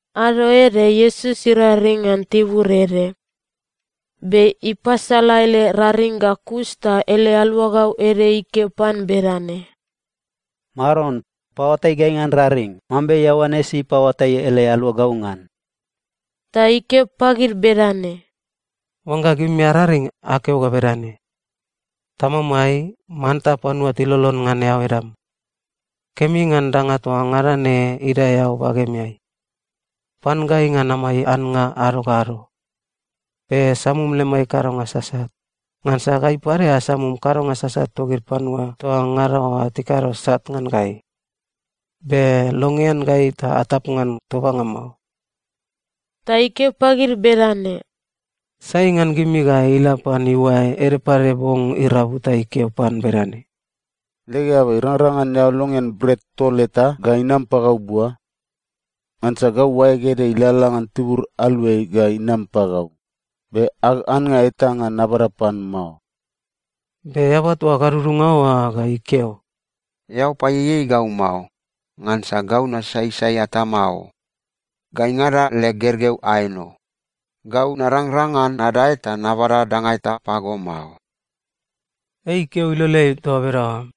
Ado ede Iesus iraring ngan tibur ede. Be ipasala ele raring ga kus ta ele aluagau ede ikeo pan bedane, “Maron, paoatai gai ngan raring mambe Ioanes ipaoatai ele aluagau ngan.” Ta ikeo pagid bedane, “Oangga gimi araring, akeo ga bedane, “‘Tamamai, manta panua tilolon ngan eao edam, kemi ngan danga toa ngada ne idae eao bagemeai. Pan gai ngan amai annga ado ga ado. Be samum lemai kadonga sasat, ngansa gai pade asamum kadonga sasat togid panua toa ngada oa tikado sat ngan gai. Be longean gai ta atap ngan tobanga mao.’” Ta ikeo pagid bedane, “Sai ngan gimi ga ila pan iuae ede pade bong irabu ta ikeo pan bedane, ‘Leg eaba, irangrang ngan eao longean bret tol eta ga inam pagau bua? Ngansa gau oaeg ede ilalala ngan tibur aluai ga inam pagau, be ag annga eta ngan nabada pan mao’? “Be eaba toa gadudunga oa ga ikeo, ‘Eao paieiei gau mao. Ngansa gau nasaisai atama o. Gaingada leg gergeu aeno. Gau narangrang ngan nadae ta nabada danga eta pago mao!’ Ei ikeo iloleai toa bedaoa,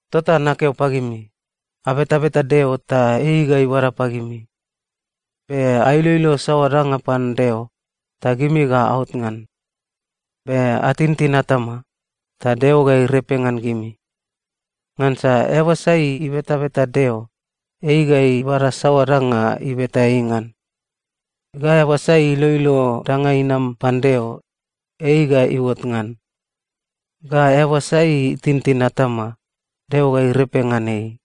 “Tota nakeo pagimi, abetabeta Deo, ta ei ga ibada pagimi. Be ailoilo saoa danga pan Deo, ta gimi ga aot ngan. Be atintin atama, ta Deo ga irepe ngan gimi. Ngansa eaba sai ibetabeta Deo, ei ga ibada saoa danga ibeta ei ngan. Ga eaba sai iloilo danga inam pan Deo, ei ga iuot ngan. Ga eaba sai itintin atama, Deo ga irepe ngan ei.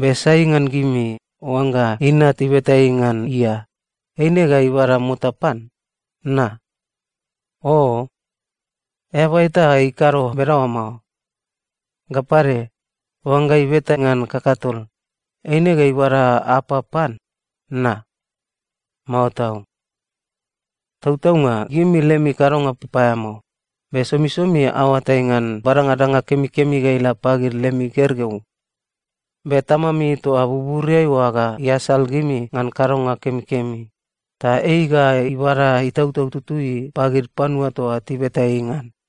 “Be sai ngan gimi, oangga inat ibeta ei ngan ia, eine ga ibada mota pan? Na? Oo, eaba eta ikado bedaoa mao! Ga pade, oangga ibeta ngan kakatol, eine ga ibada apap pan? Na? Mao tau! Tautaunga gimi lemi kadonga papaeamao, be somisomi aoatai ngan badanga danga kemikemi ga ila pagid lemi gergeu. Be Tamami toa buburiai oa ga iasal gimi ngan kadonga kemikemi, ta ei ga ibada Itautau Tutui pagid panua toa tibeta ei ngan.”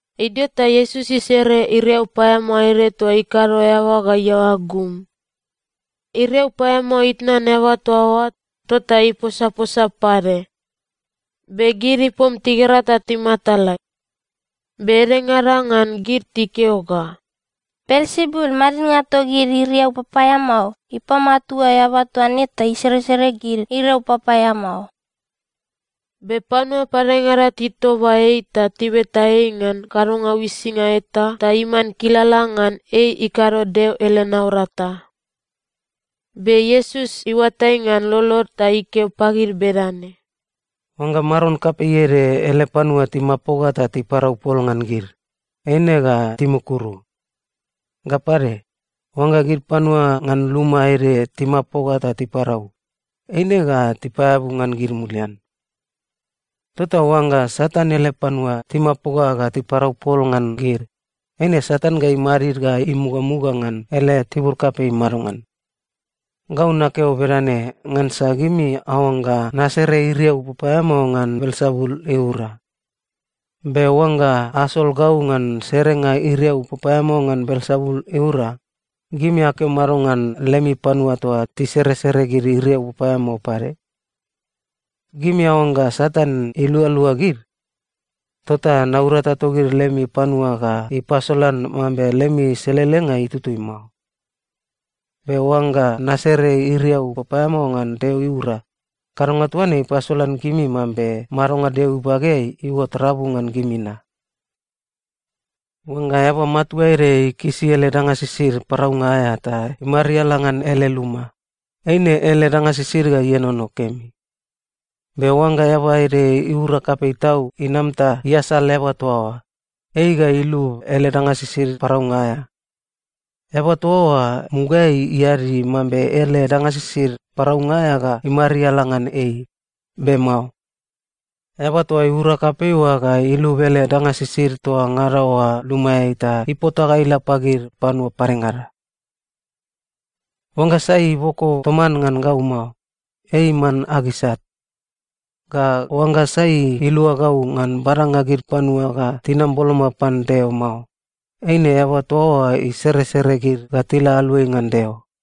Idio ta Iesus isere iriau paeamao ede toa ikado eaba ga iaoa gum. Iriau paeamao itnan eaba toa oa, tota iposaposa pade, be gid ipom tigera ta timatala. Be edengada ngan gid tikeo ga, “Belsebul, madidnga togid iriau papaeamao, ipamatua eaba toa ne ta iseresere gid iriau papaeamao.” Be panua padengada titoba ei ta tibeta ei ngan kadonga uisinga eta ta iman kilala ngan ei ikado Deo ele naurata. Be Iesus iuatai ngan lolod ta ikeo pagid bedane, “Oangga maron kapei ede ele panua timapoga ta tiparau pol ngan gid, eine ga timukuru. Ga pade, oangga gid panua ngan luma ede timapoga ta tiparau, eine ga tipaeabu ngan gid mulian. Tota oangga Satan ele panua timapoga ga tiparau pol ngan gid, eine Satan ga imadid ga imugamuga ngan ele tibur kapei madongan? Gau nakeo bedane ngansa gimi aoangga nasere iriau papaeamao ngan Belsebul iura. Be oangga asol gau ngan serenga iriau papaeamao ngan Belsebul iura, gimi akeo mado ngan lemi panua toa tiseresere gid iriau papaeamao pade? Gimi aoangga Satan ilualua gid? Tota naurata togid lemi panua ga ipasolan mambe lemi selelenga itutui mao. Be oangga nasere iriau papaeamao ngan Deo iura, kadonga toa ne ipasolan gimi mambe madonga Deo ibageai iuot rabu ngan gimi na. “Oangga eaba matua ede ikisi ele danga sisid paraunga aea ta imariala ngan ele luma, eine ele danga sisid ga ienono kemi. Be oangga eaba ede iura kapei tau inam ta iasal eaba toa oa, ei ga ilub ele danga sisid paraunga aea. Eaba toa oa mugaeai iadi mambe ele danga sisid paraunga aea ga imariala ngan ei, be mao. Eaba toa iura kapei oa ga ilub ele danga sisid toa ngada oa lumaeai ta ipota ga ila pagid panua padengada. “Oangga sai iboko toman ngan gau mao, ei iman ag isat. Ga oangga sai ilua gau ngan badanga gid panua ga tinam boloma pan Deo mao, eine eaba toa oa iseresere gid ga tila aluai ngan Deo.”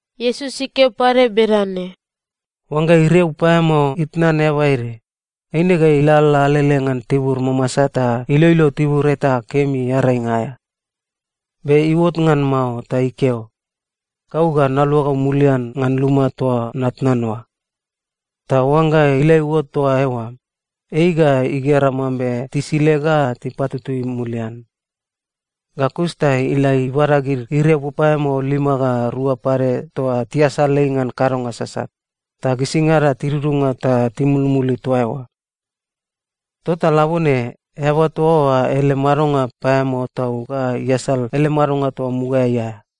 Iesus ikeo pade bedane, “Oangga iriau paeamao itnan eaba ede, eine ga ilalala alele ngan tibur mamasa ta iloilo tibur eta kemi earainga aea. Be iuot ngan mao ta ikeo, ‘Gau ga naluagau mulian ngan luma toa natnan oa.’ Ta oangga ila iuot toa eoa, ei ga igera mambe tisile ga tipatutui mulian. Ga kus ta ila ibada gid iriau papaeamao lima ga rua pade toa tiasal ei ngan kadonga sasat, ta gisingada tidudunga ta timulmuli toa eoa. Tota labone, eaba toa oa ele madonga paeamao tau ga iasal ele madonga toa mugaeai aea.”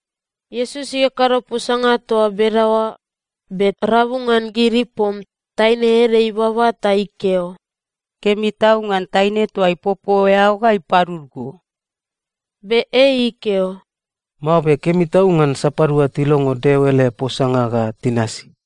Iesus ikakado posanga toa bedaoa, be rabu ngan gid ipom, taine ede ibaba ta ikeo, “Kemi tau ngan taine toa ipopo eao ga ipadud go!” Be ei ikeo, “Mao be kemi tau ngan sapadua tilongo Deo ele posanga ga tinasi.”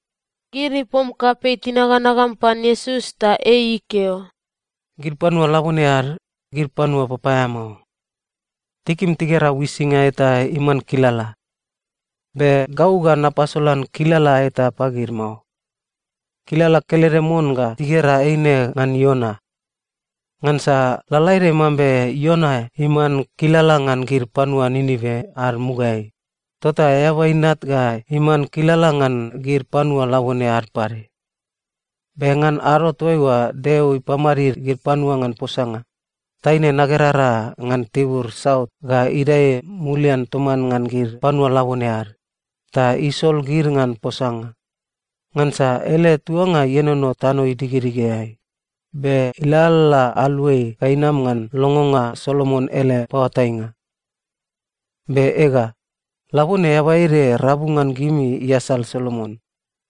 Gid ipom kapei tinaganagam pan Iesus, ta ei ikeo, “Gid panua labone ad, gid panua papaeamao. Tikim tigera uisinga eta iman kilala. Be gau ga napasolan kilala eta pagid mao. Kilala kelede mon ga tigera eine ngan Iona. Ngansa lalaede mambe Iona iman kilala ngan gid panua Ninive ad mugaeai, tota Eaba Inat ga iman kilala ngan gid panua labone ad pade. Be ngan ado toaiua Deo ipamadid gid panua ngan posanga, taine nagerara ngan tibur saut ga idae mulian toman ngan gid panua labone ad, ta isol gid ngan posanga. Ngansa ele tuanga ienono tano idigedigeai, be ilalala aluai ga inam ngan longonga Solomon ele paoatainga. Be ega, labone eaba ede rabu ngan gimi iasal Solomon.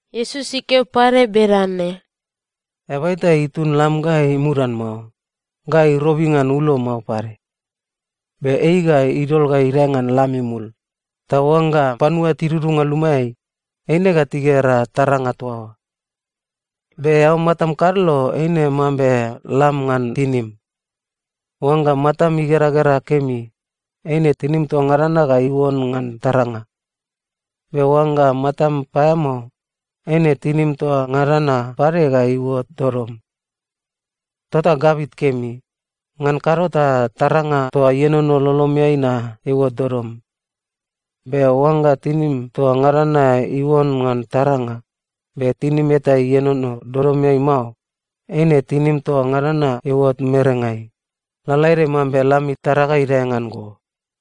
Iesus ikeo pade bedane, “Eaba eta itun lam ga imudan mao, ga irobi ngan ulo mao pade. Be ei ga idol ga idae ngan lam imul, ta oangga panua tidudunga lumaeai, eine ga tigera taranga toa oa. Be eao matam kadlo eine mambe lam ngan tinim. Oangga matam igeragera kemi, eine tinim toa ngada na ga iuon ngan taranga. Be oangga matam paeamao, eine tinim toa ngada na pade ga iuot dodom. Tota gabit kemi. Ngan kado ta taranga toa ienono lolomeai na iuot dodom. Be oangga tinim toa ngada na iuon ngan taranga, be tinim eta ienono dodomeai mao, eine tinim toa ngada na iuot merengai, lalaede mambe lam itara ga idae ngan go.”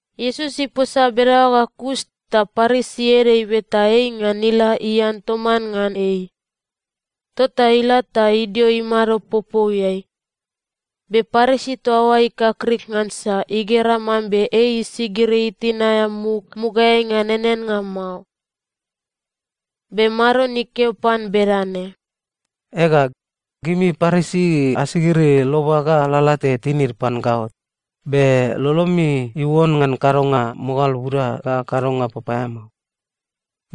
Iesus iposa bedaoa ga kus, ta Parisi ede ibeta ei ngan ila ian toman ngan ei. Tota ila ta idio imado popouiai. Be Parisi toa oa ikakrik ngansa igera mambe ei isigiri itin aea muk mugaeai ngan eaneannga mao. Be Maron ikeo pan bedane, “Ega, gimi Parisi asigiri loba ga lalate tinid pan gaot, be lolomi iuon ngan kadonga mogal buda ga kadonga papaeamao.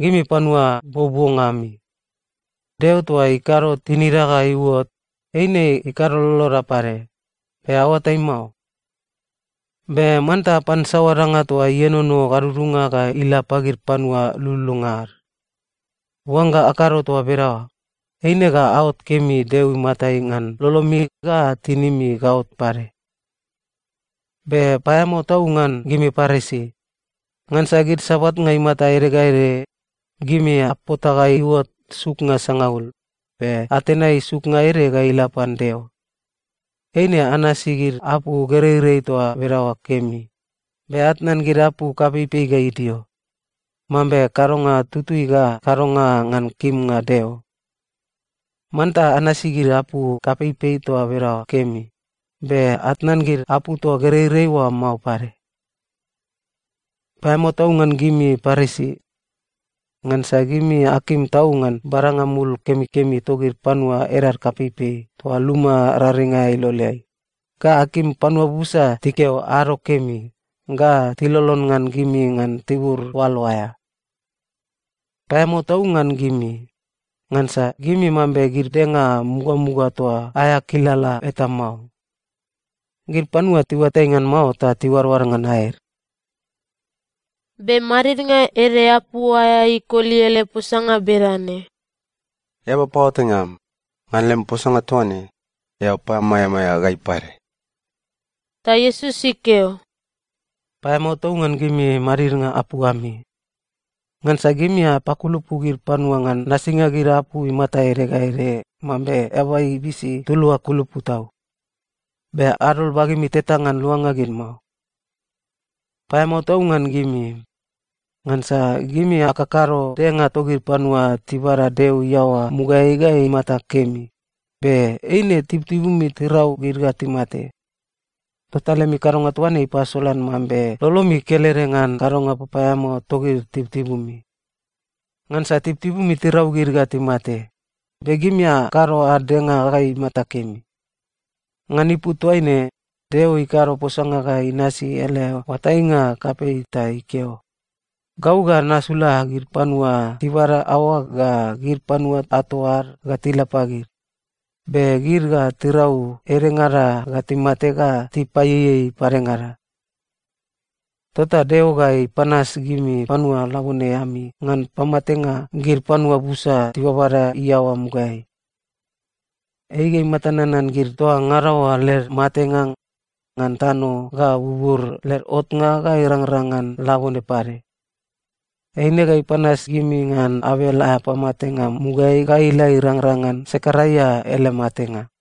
Gimi panua buobuonga ami! Deo toa ikado tinida ga iuot, eine ikado loloda pade, be aoatai mao? Be manta apan saoa danga toa ienono gadudunga ga ila pagid panua lululunga ad. Oangga akado toa bedaoa, eine ga aot kemi Deo imatai ngan lolomi ga tinimi gaot pade. “Be paeamao tau ngan gimi Parisi! Ngansa gid sabatnga imata ede ga ede, gimi apota ga iuot suknga sangaul, be atenai suknga ede ga ila pan Deo. Eine anasi gid apu gereirei toa bedaoa kemi, be atnan gid apu kapeipei ga idio, mambe kadonga tutui ga kadonga ngan kimnga Deo. Manta anasi gid apu kapeipei toa bedaoa kemi, be atnan gid apu toa gereirei oa mao pade. “Paeamao tau ngan gimi Parisi! Ngansa gimi akim tau ngan badanga mul kemikemi togid panua edad kapeipei toa luma raring aea iloleai, ga akim panua busa tikeo ‘ado kemi’ ga tilolon ngan gimi ngan tibur oalo aea. “Paeamao tau ngan gimi! Ngansa gimi mambe gid denga mugamuga toa aea kilala eta mao. Gid panua tiuatai ngan mao ta tiuadoad ngan aed.” Be madidnga ede apu aea ikoli ele posanga bedane, “Eaba paoatainga am, ngan lem posanga toa ne, eao pamaeamaea gai pade.” Ta Iesus ikeo, “Paeamao tau ngan gimi madidnga apu ami! Ngansa gimi apakulupu gid panua ngan nasinga gid apu imata ede ga ede mambe eaba ibisi tulua kulupu tau. Be adol bagemi teta ngan luanga gid mao. “Paeamao tau ngan gimi! Ngansa gimi akakado denga togid panua tibada Deo iaoa mugaeai ga imata kemi, be eine tibutibumi tirau gid ga timate. Tota lemi kadonga toa ne ipasolan mambe lolomi kelede ngan kadonga papaeamao togid tibutibumi. Ngansa tibutibumi tirau gid ga timate, be gimi akado ad denga ga imata kemi. Ngan ipu toaine, Deo ikado posanga ga inasi ele oatainga kapei ta ikeo, ‘Gau ga nasula gid panua tibada aoag ga gid panua ato ad ga tila pagid, be gid ga tirau edengada ga timate ga tipaieiei padengada.’ Tota Deo ga ipanas gimi panua labone ami ngan pamatenga gid panua busa tibabada iaoa mugaeai. Ei ga imata nanan gid toa ngada oa led matenga, ngan tano ga bubur led otnga ga irangrang ngan labone pade. Eine ga ipanas gimi ngan Abel aea pamatenga mugaeai ga ila irangrang ngan Sekaraia ele matenga.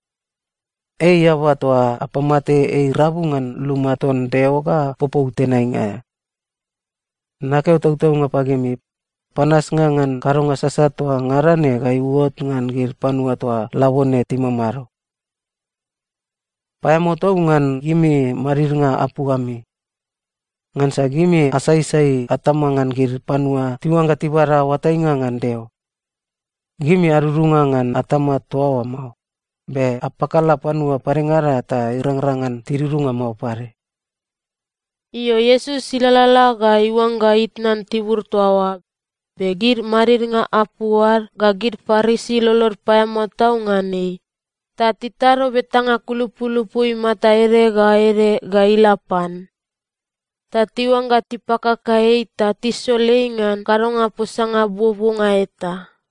Ei eaba toa apamate ei rabu ngan luma ton Deo ga popou tenainga aea. Nakeo tautaunga pagimi, panasnga ngan kadonga sasat toa ngada ne ga iuot ngan gid panua toa labone timamado. “Paeamao tau ngan gimi madidnga apu ami! Ngansa gimi asaisai atama ngan gid panua tiuangga tibada oatainga ngan Deo. Gimi adudunga ngan atama toa oa mao, be apakala panua padengada ta irangrang ngan tidudunga mao pade.” Io, Iesus ilalala ga iuangga itnan tibur toa oa, be gid madidnga apu ad ga gid Parisi lolod paeamao tau ngan ei, ta titado betanga kulupulupu imata ede ga ede ga ila pan. Ta tiuangga tipakaka ei ta tisol ei ngan kadonga posanga buobuonga eta.